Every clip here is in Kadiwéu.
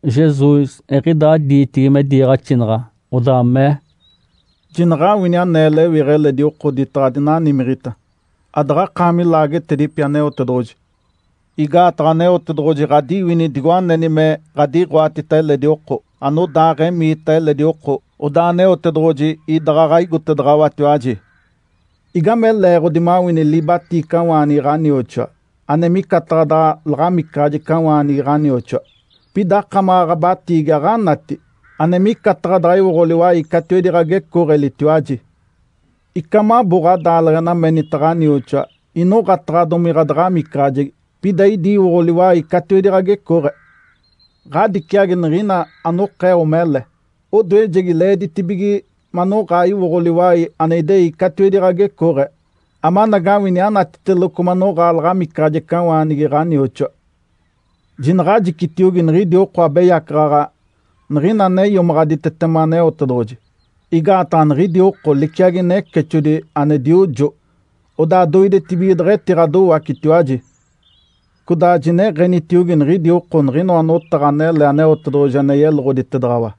Jesus eɡ̶idaa diitigi me diiɡ̶axinaɡ̶a, odaa mee, “Jinaɡ̶awini anee lewiɡ̶a eledi oko oditaɡ̶a adinanimiɡ̶ita, adaɡ̶aɡ̶akaami laagetedipi Aneotedoɡ̶oji. Igaataɡ̶a Aneotedoɡ̶oji ɡ̶adiwini digo aneni me ɡ̶adiɡ̶oatita eledi oko. Anodaaɡ̶emiita eledi oko, odaa Aneotedoɡ̶oji idaɡ̶aɡ̶a igotedaɡ̶awatiwaji. Igame leeɡ̶odi mawini libatiicawaanigi ɡ̶anioxoa, ane micataɡ̶a daɡ̶a laɡ̶amicaɡ̶ajecawaanigi ɡ̶anioxoa, pida akamaɡ̶a ɡ̶abatiigi aɡ̶anati, ane micataɡ̶a daɡ̶a iwoɡ̶o liwai catiwedi ɡ̶agecooɡ̶elitiwaji? Ica mabo ɡ̶adaaleɡ̶ena menita ɡ̶anioxoa, ‘Inoɡ̶ataɡ̶adomi ɡ̶adaɡ̶amicaɡ̶ajegi’, pida idi iwoɡ̶o liwai catiwedi ɡ̶agecooɡ̶e? Ǥadiciagi niɡ̶ina anokeo mele! Odoejegi leeditibige manoɡ̶aa iwoɡ̶o liwai ane idei catiwedi ɡ̶agecooɡ̶e, amanagawini anatiteloco manoɡ̶aa laɡ̶amicaɡ̶ajecawaanigi ɡ̶anioxoa. Jinaɡ̶ajicitiogi niɡ̶idi oko abeyacaɡ̶aɡ̶a niɡ̶ina ane iomaɡ̶aditetema Aneotedoɡ̶oji. Igaataɡ̶a niɡ̶idi oko liciagi necexodi ane diojo, odaa doidetibige deɡ̶etiɡ̶adowacitiwaji. Codaa jineɡ̶enitiogi niɡ̶idi oko niɡ̶inoa notaɡ̶a anele Aneotedoɡ̶oji ane yeloɡ̶oditedaɡ̶awa,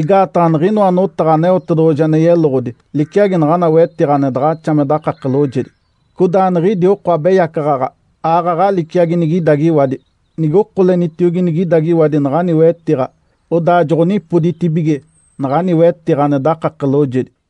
igaataɡ̶a niɡ̶inoa notaɡ̶a Aneotedoɡ̶oji ane yeloɡ̶odi liciagi naɡ̶ana wetiɡ̶a ane daɡ̶axa me dakake loojedi. Codaa niɡ̶idi oko abeyacaɡ̶aɡ̶a aaɡ̶aɡ̶a liciagi nigidagiwadi. Nige okolenitiogi nigidagiwadi naɡ̶ani wetiɡ̶a, odaa joɡ̶onipoditibige naɡ̶ani wetiɡ̶a ane dakake loojedi.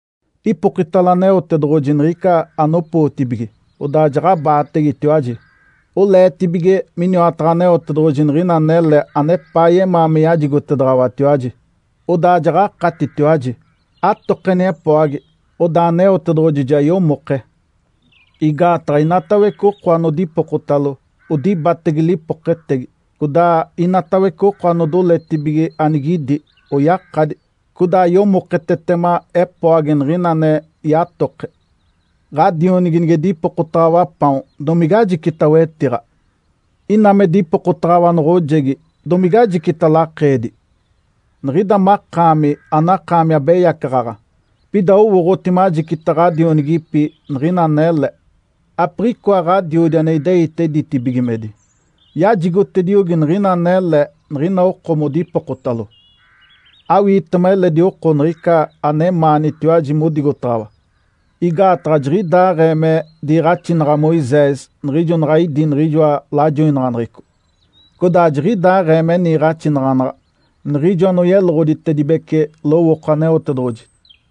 Ipokitalo Aneotedoɡ̶oji niɡ̶ica anopootibige, odaa jaɡ̶abaategetiwaji. Oleetibige miniwataɡ̶a Aneotedoɡ̶oji niɡ̶ina anele anepaa yemaa me yajigotedaɡ̶awatiwaji, odaa jaɡ̶akatitiwaji. Atokeni epoagi, odaa Aneotedoɡ̶oji ja yomoke. Igaataɡ̶a inatawece oko anodipokotalo, odibatege lipoketegi, codaa inatawece oko anodoletibige anigidi, oyakadi. Codaa yomoketetema epoagi niɡ̶ina ane yatoke. Ǥadionigi nige dipokotaɡ̶awa paon, domige ajicita wetiɡ̶a? Ina me dipokotaɡ̶awa noɡ̶ojegi, domige ajicita lakeedi? Niɡ̶ida makaami anakaami abeyacaɡ̶aɡ̶a, pida owooɡ̶oti majicita ɡ̶adionigipi niɡ̶ina anele. Apiɡ̶ikoa Ǥadiodi ane ideite ditibigimedi yajigotediogi niɡ̶ina anele niɡ̶ina oko modipokotalo. Awiitema eledi oko niɡ̶ica anemaanitiwaji modigotaɡ̶awa. Igaataɡ̶a jiɡ̶idaaɡ̶ee me diiɡ̶axinaɡ̶a Moisés niɡ̶ijo naɡ̶a idí niɡ̶ijoa lajoinaɡ̶aneɡ̶eco, codaa jiɡ̶idaaɡ̶ee me niiɡ̶axinaɡ̶anaɡ̶a niɡ̶ijo anoyeloɡ̶oditedibece lowooko Aneotedoɡ̶oji.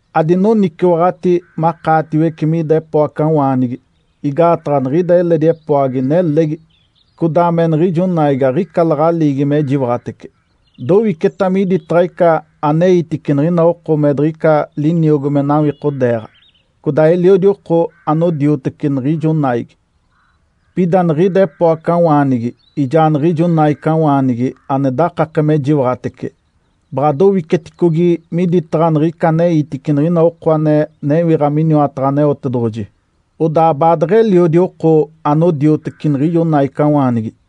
Adinoniciwaɡ̶ati makaatiwece mida epoacawaanigi. Igaataɡ̶a niɡ̶ida eledi epoagi nelegi codaa me niɡ̶ijo naigi aɡ̶ica laɡ̶aliigi me jiwaɡ̶atece dowiceta miditaɡ̶a ica aneitice niɡ̶ina oko me diɡ̶ica liniogo me nawikodeeɡ̶a. Codaa eliodi oko anodioteci niɡ̶ijo naigi. Pida niɡ̶ida epoacawaanigi ijaa niɡ̶ijo naicawaanigi ane dakake me jiwaɡ̶atece, baɡ̶a dowiceticogi miditaɡ̶a niɡ̶ica aneitice niɡ̶ina oko ane newiɡ̶a miniwataɡ̶a Aneotedoɡ̶oji, odaa baadeɡ̶eliodi oko anodioteci niɡ̶ijo naicawaanigi.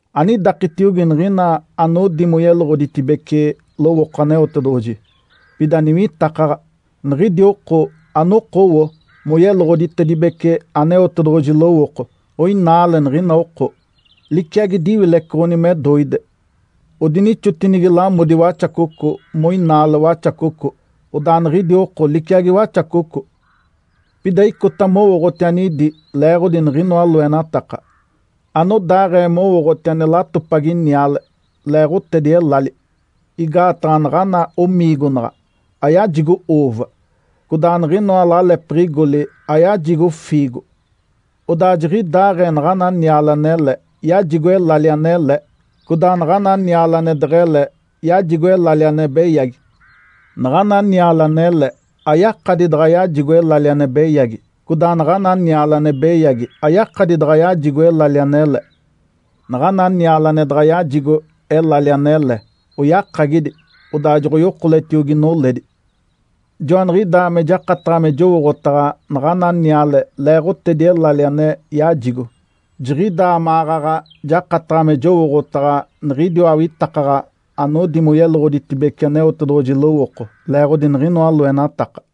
Anidakitiogi niɡ̶ina anodi moyeloɡ̶oditedibece lowooko Aneotedoɡ̶oji, pida niwitakaɡ̶a. Niɡ̶idi oko anokowo moyeloɡ̶oditedibece Aneotedoɡ̶oji lowooko oinaale niɡ̶ina oko. Liciagi diwilecoɡ̶oni me doide, odinixotinigi lamodi waxacoco moinaale waxacoco. Odaa niɡ̶idi oko liciagi waxacoco. Pida icota mowooɡ̶oti anidi leeɡ̶odi niɡ̶inoa loenataka, anodaaɡ̶ee mowooɡ̶oti ane latopagi niale leeɡ̶otedi elali. Igaataɡ̶a naɡ̶ana omiigonaɡ̶a ayajigo uuva, codaa niɡ̶inoa lalepiɡ̶igoli aɡ̶oyajigo fiigo. Odaa jiɡ̶idaaɡ̶ee naɡ̶ana niale anele yajigo elali anele, codaa naɡ̶ana niale ane deɡ̶ele yajigo elali ane beyagi. Naɡ̶ana niale anele ayakadi daɡ̶a yajigo elali ane beyagi. Codaa naɡ̶ana niale ane beyagi ayakadi daɡ̶a yajigo elali anele. Naɡ̶ana niale ane daɡ̶a yajigo elali anele, oyakagidi, odaa joɡ̶oyokoletiogi noledi. Joaniɡ̶idaa me jakataɡ̶a me jowooɡ̶otaɡ̶a naɡ̶ana niale leeɡ̶otedi elali ane yajigo. Jiɡ̶idaa maɡ̶aɡ̶a jakataɡ̶a me jowooɡ̶otaɡ̶a niɡ̶idiwa awitakaɡ̶a anodi moyeloɡ̶oditedibece Aneotedoɡ̶oji lowooko, leeɡ̶odi niɡ̶inoa loenataka.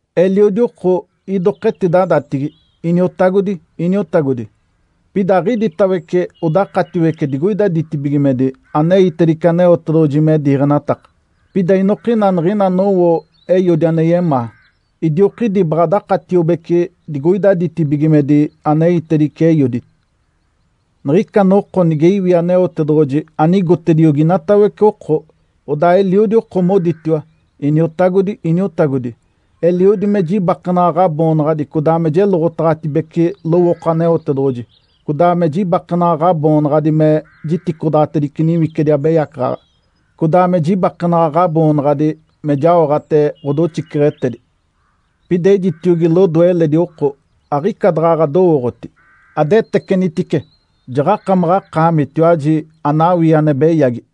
Eliodi oko idoka etidadatigi, ‘Iniotagodi, Iniotagodi!’ Pida aɡ̶iditawece odakatiwece digoida ditibigimedi aneitedice Aneotedoɡ̶oji me diiɡ̶enataka. Pida inokina niɡ̶ina anowo Eiodi ane yemaa, idiokidi baɡ̶a dakatiobece digoida ditibigimedi aneitedice Eiodi. Niɡ̶ica noko nige iwi Aneotedoɡ̶oji anigotediogi inatawece oko, odaa eliodi oko moditiwa, ‘Iniotagodi, Iniotagodi! Eliodi me jibakenaɡ̶a Ǥaboonaɡ̶adi codaa jeloɡ̶otaɡ̶atedibece lowooko Aneotedoɡ̶oji, codaa me jibakenaɡ̶a Ǥaboonaɡ̶adi me jiticodaɡ̶atedice niwicidi abeyacaɡ̶aɡ̶a, codaa me jibakenaɡ̶a Ǥaboonaɡ̶adi me jaoɡ̶ate ɡ̶odoxiceɡ̶etedi.’ Pida ejitiogi lodoe eledi oko, ‘Aɡ̶ica daɡ̶a ɡ̶adowooɡ̶oti. Adetecenitice, jaɡ̶akamaɡ̶akaamitiwaji anawii ane beyagi!’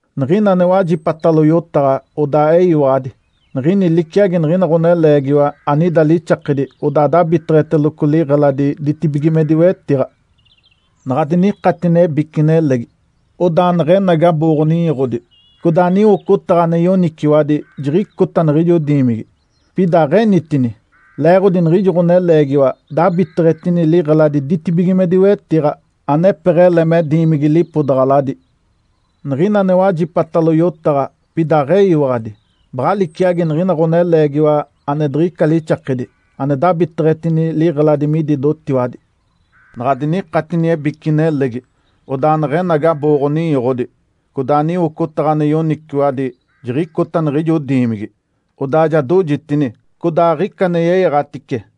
Niɡ̶ina ane wajipatalo yotaɡ̶a odaa eyiwaɡ̶adi, niɡ̶ini liciagi niɡ̶ina ɡ̶oneleegiwa anida lixakedi odaa dabiteɡ̶eteloco liɡ̶eladi ditibigimedi wetiɡ̶a. Naɡ̶a dinikatini ebici nelegi, odaa neɡ̶enagi abooɡ̶o-ninyoɡ̶odi, codaa niwocotaɡ̶a ane yoniciwadi jiɡ̶icota niɡ̶ijo diimigi, pida aɡ̶enitini. Leeɡ̶odi niɡ̶ijo ɡ̶oneleegiwa dabiteɡ̶etini liɡ̶eladi ditibigimedi wetiɡ̶a, anepeɡ̶ele me diimigi lipodaɡ̶aladi. Niɡ̶ina ane wajipatalo yotaɡ̶a pida aɡ̶eyiwaɡ̶adi, baɡ̶a liciagi niɡ̶ina ɡ̶oneleegiwa ane diɡ̶ica lixakedi ane dabiteɡ̶etini liɡ̶eladi midi dotiwadi. Naɡ̶a dinikatini ebici nelegi, odaa neɡ̶enagi abooɡ̶o-ninyoɡ̶odi, codaa niwocotaɡ̶a ane yoniciwadi jiɡ̶icota niɡ̶ijo diimigi, odaa ja dojitini, codaa aɡ̶ica ane yeyaɡ̶atice.”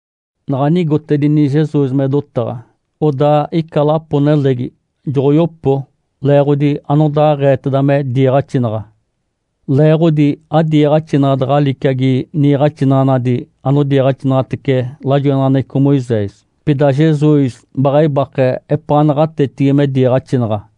Naɡ̶a nigotedini Jesus me dotaɡ̶a, odaa ica lapo-nelegi joɡ̶oyopo leeɡ̶odi anodaaɡ̶eeteda me diiɡ̶axinaɡ̶a. Leeɡ̶odi adiiɡ̶axinaɡ̶a daɡ̶a liciagi niiɡ̶axinaɡ̶anadi anodiiɡ̶axinaɡ̶atece lajoinaɡ̶aneɡ̶eco Moisés, pida Jesus baɡ̶a ibake epaa naɡ̶atetigi me diiɡ̶axinaɡ̶a.